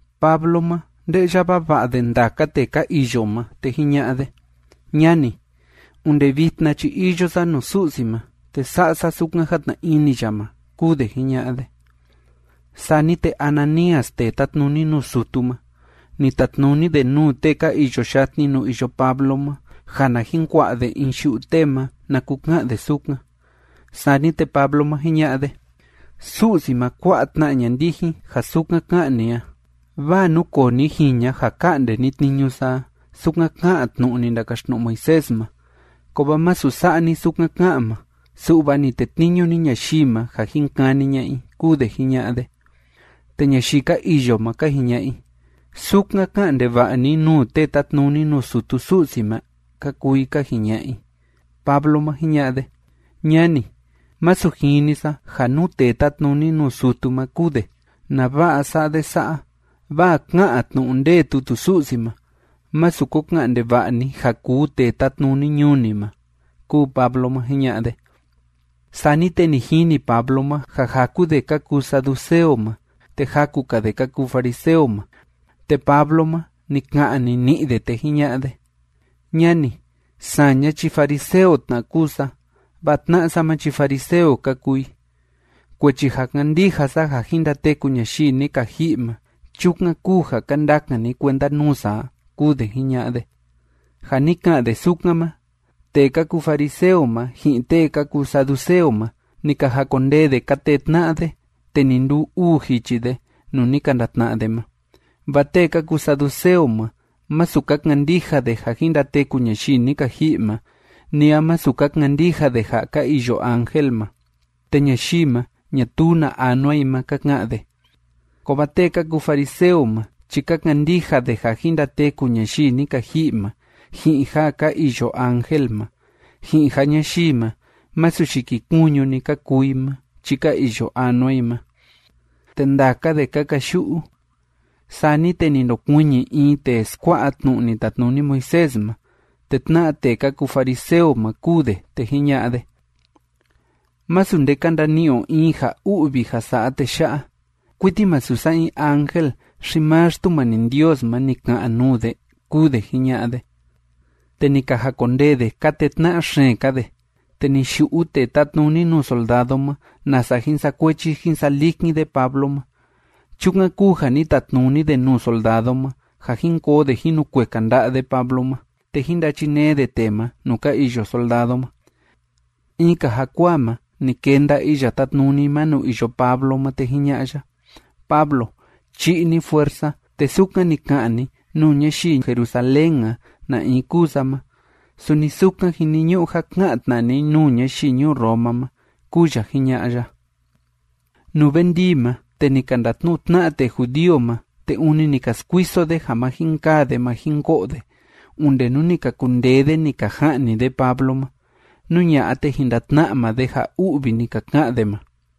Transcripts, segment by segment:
Pablo ma, nde'ya vava'a de ndaka tee ka iyo ma, te jiña'a de: ―Ñani, onde vitna chi iyo sa nuu Su'si ma, te sa'a sa sukan játna ini ya ma ―kúu de jiña'a de. Sani te Ananías tee tátnuni nuu sutu ma, ni tatnuni de nuu tee ka iyo yatni nuu iyo Pablo ma ja na jin kua'a de in yu'u tee ma naku ka'an de sukan. Sani te Pablo ma, jiña'a de: ―Su'si ma, kua'a tna ña'a ndijin ja sukan ká'an ni a, vaa núkoo ni jiña ja ka'nde ni tniñu sa a, sukan ká'an tnu'u ni ndakaxtnu'u Moisés ma. Kovaa masu sa'a ni sukan ká'an ma, su'va ni tetniñu ni ñayii ma ja jin kani ña'a i ―kúu de jiña'a de. Te ñayii ka iyo ma, ka jiña'a i: ―¿Sukan ká'an ndeva'a ni nuu tee tátnuni nuu sutu Su'si ma? ―ka kuu i ka jiña'a i. Pablo ma, jiña'a de: ―Ñani, masu jini sa ja nú tee tátnuni nuu sutu ma kúu de, nava'a sa'a de sa'a. Vaa ká'an tnu'u ndee tutu Su'si ma: “Másu ko ka'an ndeva'a ni ja kuu tee tátnuni ñuu ni ma” ―kúu Pablo ma jiña'a de. Sani te ni jini Pablo ma ja jaku de ka kuu saduceo ma, te jaku‑ka de ka kuu fariseo ma, te Pablo ma, ni ka'an nini'i de, te jiña'a de: ―Ñani, saña chi fariseo tna kúu sa, vaa tna'a sa ma chi fariseo ka kuu i. Kuechi ja kándija sa ja jin ndateku ñayii ni ka ji'i ma, chukan kúu ja ka ndakan ni kuenda nuu sa a ―kúu de jiña'a de. Ja ni ka'an de sukan ma, tee ka kuu fariseo ma ji'in tee ka kuu saduceo ma, ni ka jakondee de ka tetna'a de, te ni nduu uu jichi de nuu ni ka ndatna'a de ma. Vaa tee ka kuu saduceo ma, masu ka kandija de ja jin ndateku ñayii ni ka ji'i ma, ni a masu ka kandija de ja ka iyo ángel ma, te ñayii ma, ñatuu na anua i ma, ka ka'an de. Kovaa tee ka kuu fariseo ma chi ka kandija de ja jin ndateku ñayii ni ka ji'i ma, ji'in ja ka iyo ángel ma, ji'in ja ñayii ma, masu yikikuñu‑ni ka kuu i ma chi ka iyo anua i ma. Te ndaka de ka kayu'u. Sani te ni ndokuiñi in tee skua'a tnu'u ni tatnuni Moisés ma, te tna'a tee ka kuu fariseo ma kúu de, te jiña'a de: ―Masu nde ka ndani'i o in ja u'vi ja sa'a tee ya'a, kuiti masu saa in ángel xi maa Xtumani Ndios ma ni ka'an nuu de ―kúu de jiña'a de. Te ni ka jakondee de ka tetna'a xeen‑ka de, te ni yu'u tee tátnuni nuu soldado ma nasa jin sakuechi jin salikin de Pablo ma. Chukan kúu ja ni tatnuni de nuu soldado ma ja jín koo de jín nu kueka nda'a de Pablo ma, te jín ndachinee de tee ma nuu ka iyo soldado ma. In‑ka jakuaa ma, ni kenda Iya Tátnuni ma nuu iyo Pablo ma, te jiña'a ya: ―Pablo, chi'i ni fuerza. Te sukan ni ka'an ni nuu ñayii Jerusalén a na in kúu sa ma, suni sukan jiniñu'u ja ka'an tna ni nuu ñayii ñuu Roma ma ―kúu ya jiña'a ya. Nuu ve ndii ma, te ni ka ndatnu'u tna'a tee judío ma, te ûni ni ka skuiso de ja ma jin kaa de, ma jin ko'o de, onde nuu ni ka kundee de ni ka ja'ni de Pablo ma. Nú ña'a, te jin ndatna'a maa de ja u'vi, ni ka ka'an de ma.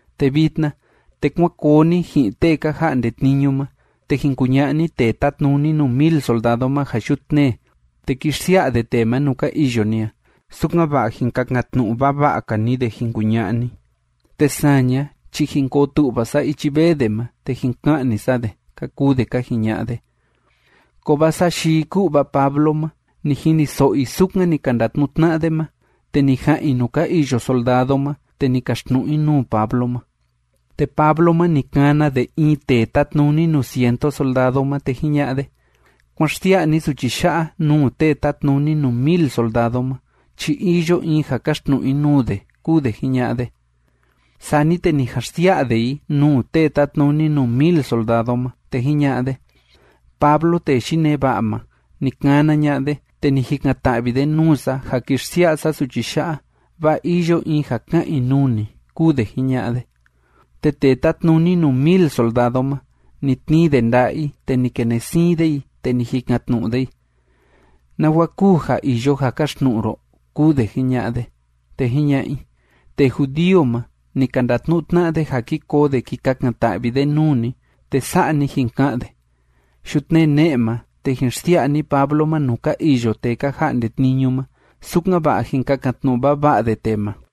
Te vitna, te kuán koo ni ji'in tee ka ja'nde tniñu ma, te jin kuña'a ni tee tátnuni nuu mil soldado ma ja yutnee, te kí xsia'a de tee ma nuu ka iyo ni a, sukan‑va'a jin kakan‑tnu'u vava'a‑ka ni de, jin kuña'a ni, te saña chi jin koo tu'va sa ichi vee de ma, te jin ka'ni sa de ―ka kuu de ka jiña'a de. Kovaa sayii ku'va Pablo ma, ni jiniso'o i sukan ni ka ndatnu'u tna'a de ma, te ni ja'an i nuu ka iyo soldado ma, te ni kaxtnu'u i nuu Pablo ma. Te Pablo ma, ni kana de in tee tátnuni nuu cientu soldado ma, te jiña'a de: ―Kuán xsia'a ni suchi ya'a nuu tee tátnuni nuu mil soldado ma chi iyo in ja kaxtnu'u i nuu de ―kúu de jiña'a de. Sani te ni jan xsia'a de i nuu tee tátnuni nuu mil soldado ma, te jiña'a de: ―Pablo tee yinee va'a ma, ni kana ña'a de, te ni jikan‑ta'vi de nuu sa ja ki xsia'a sa suchi ya'a, vaa iyo in ja ka'an i nuu ni ―kúu de jiña'a de. Te tee tátnuni nuu mil soldado ma, ni tnii de nda'a i, te ni kene'e siin de i, te ni jikan‑tnu'u de i: ―¿Nawa kúu ja iyo ja kaxtnu'u ro? ―kúu de jiña'a de. Te jiña'a i: ―Tee judío ma, ni ka ndatnu'u tna'a de ja ki koo de ki kakan‑ta'vi de nuu ni, te sa'a‑ni jin ka'an de: Yutnee ne'e ma, te jin xsia'a ni Pablo ma nuu ka iyo tee ka ja'nde tniñu ma, sukan‑va'a jin kakan‑tnu'u vava'a de tee ma.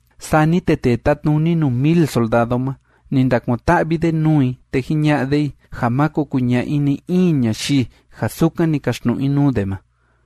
Sani te tee tátnuni nuu mil soldado ma, ni ndakuan‑ta'vi de nuu i, te jiña'a de i ja máko kuña'a i ni‑in ñayii ja sukan ni kaxtnu'u i nuu de ma.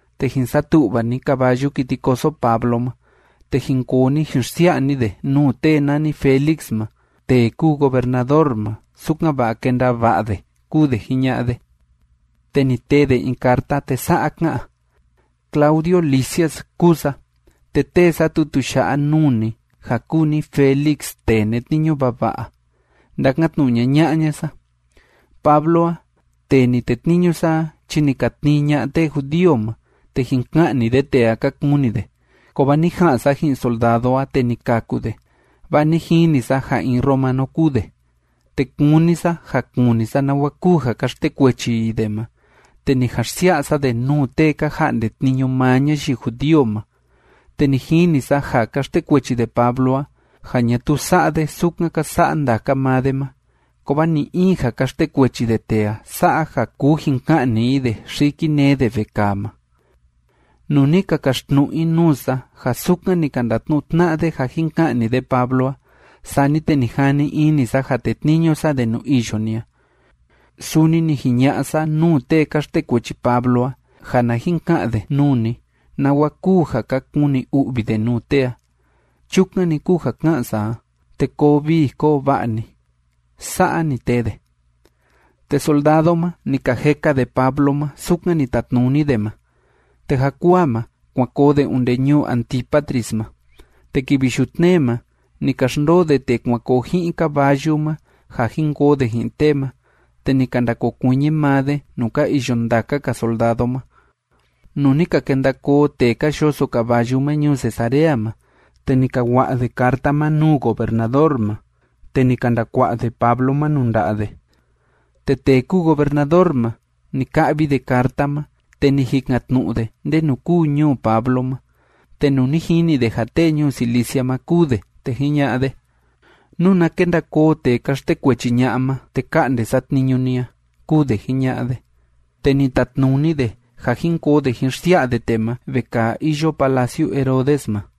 Te jin satu'va ni caballu kiti koso Pablo ma, te jin koo ni jin xsia'a ni de nuu tee nani Félix ma tee kúu gobernador ma, sukan‑va'a kenda va'a de ―kúu de jiña'a de. Te ni tee de in carta, te sa'a ká'an: “Claudio Lisias kúu sa, te tee sa tutu ya'a nuu ni ja kúu ni Félix tee netniñu vava'a: Ndakan‑tnu'u ñaña'a ña sa. Pablo a, tee ni tetniñu sa a chi ni ka tnii ña'a tee judío ma, te jin ka'ni de tee a ka kuni de, kovaa ni ja'an sa ji'in soldado a, te ni kaku de, vaa ni jini sa ja in romano kúu de. Te kúni sa ja kuni sa nawa kúu ja ka xtekuechi i de ma, te ni jan xsia'a sa de nuu tee ka ja'nde tniñu maa ñayii judío ma. Te ni jini sa ja ka xtekuechi de Pablo a ja ñatuu sa'a de sukan ka sa'a ndaka maa de ma. Kovaa ni‑in ja ka xtekuechi de tee a sa'a ja kuu jin ka'ni i de xi kinee de vekaa ma. Nuu ni ka kaxtnu'u i nuu sa ja sukan ni ka ndatnu'u tna'a de ja jin ka'ni de Pablo a, sani te ni jani ini sa ja tetniñu sa de nuu iyo ni a, suni ni jiña'a sa nuu tee ka xtekuechi Pablo a ja na jin ka'an de nuu ni nawa kúu ja ka kuni u'vi de nuu tee a. Chukan‑ni kúu ja ká'an sa a. Te koo vii koo va'a ni.” Sa'a ni tee de. Te soldado ma, ni ka jeka de Pablo ma sukan ni tatnuni de ma, te jakuaa ma kuan koo de onde ñuu Antípatris ma. Te kivi yutnee ma, ni ka xndoo de tee kuan koo ji'in caballu ma ja jin koo de ji'in tee ma, te ni ka ndakokuiñi maa de nuu ka iyo ndaka‑ka soldado ma. Nuu ni ka kenda koo tee ka yoso caballu ma ñuu Cesarea ma, te ni ka wa'a de carta ma nuu gobernador ma, te ni ka ndakua'a de Pablo ma nuu nda'a de. Te tee kúu gobernador ma, ni ka'vi de carta ma, te ni jikan‑tnu'u de ndenu kúu ñuu Pablo ma. Te nuu ni jini de ja tee ñuu Cilicia ma kúu de, te jiña'a de: ―Nuna kenda koo tee ka xtekuechi ña'a ma, te ka'nde sa tniñu ni a ―kúu de jiña'a de, te ni tatnuni de ja jín koo de jín xsia'a de tee ma vekaa iyo palaciu Herodes ma.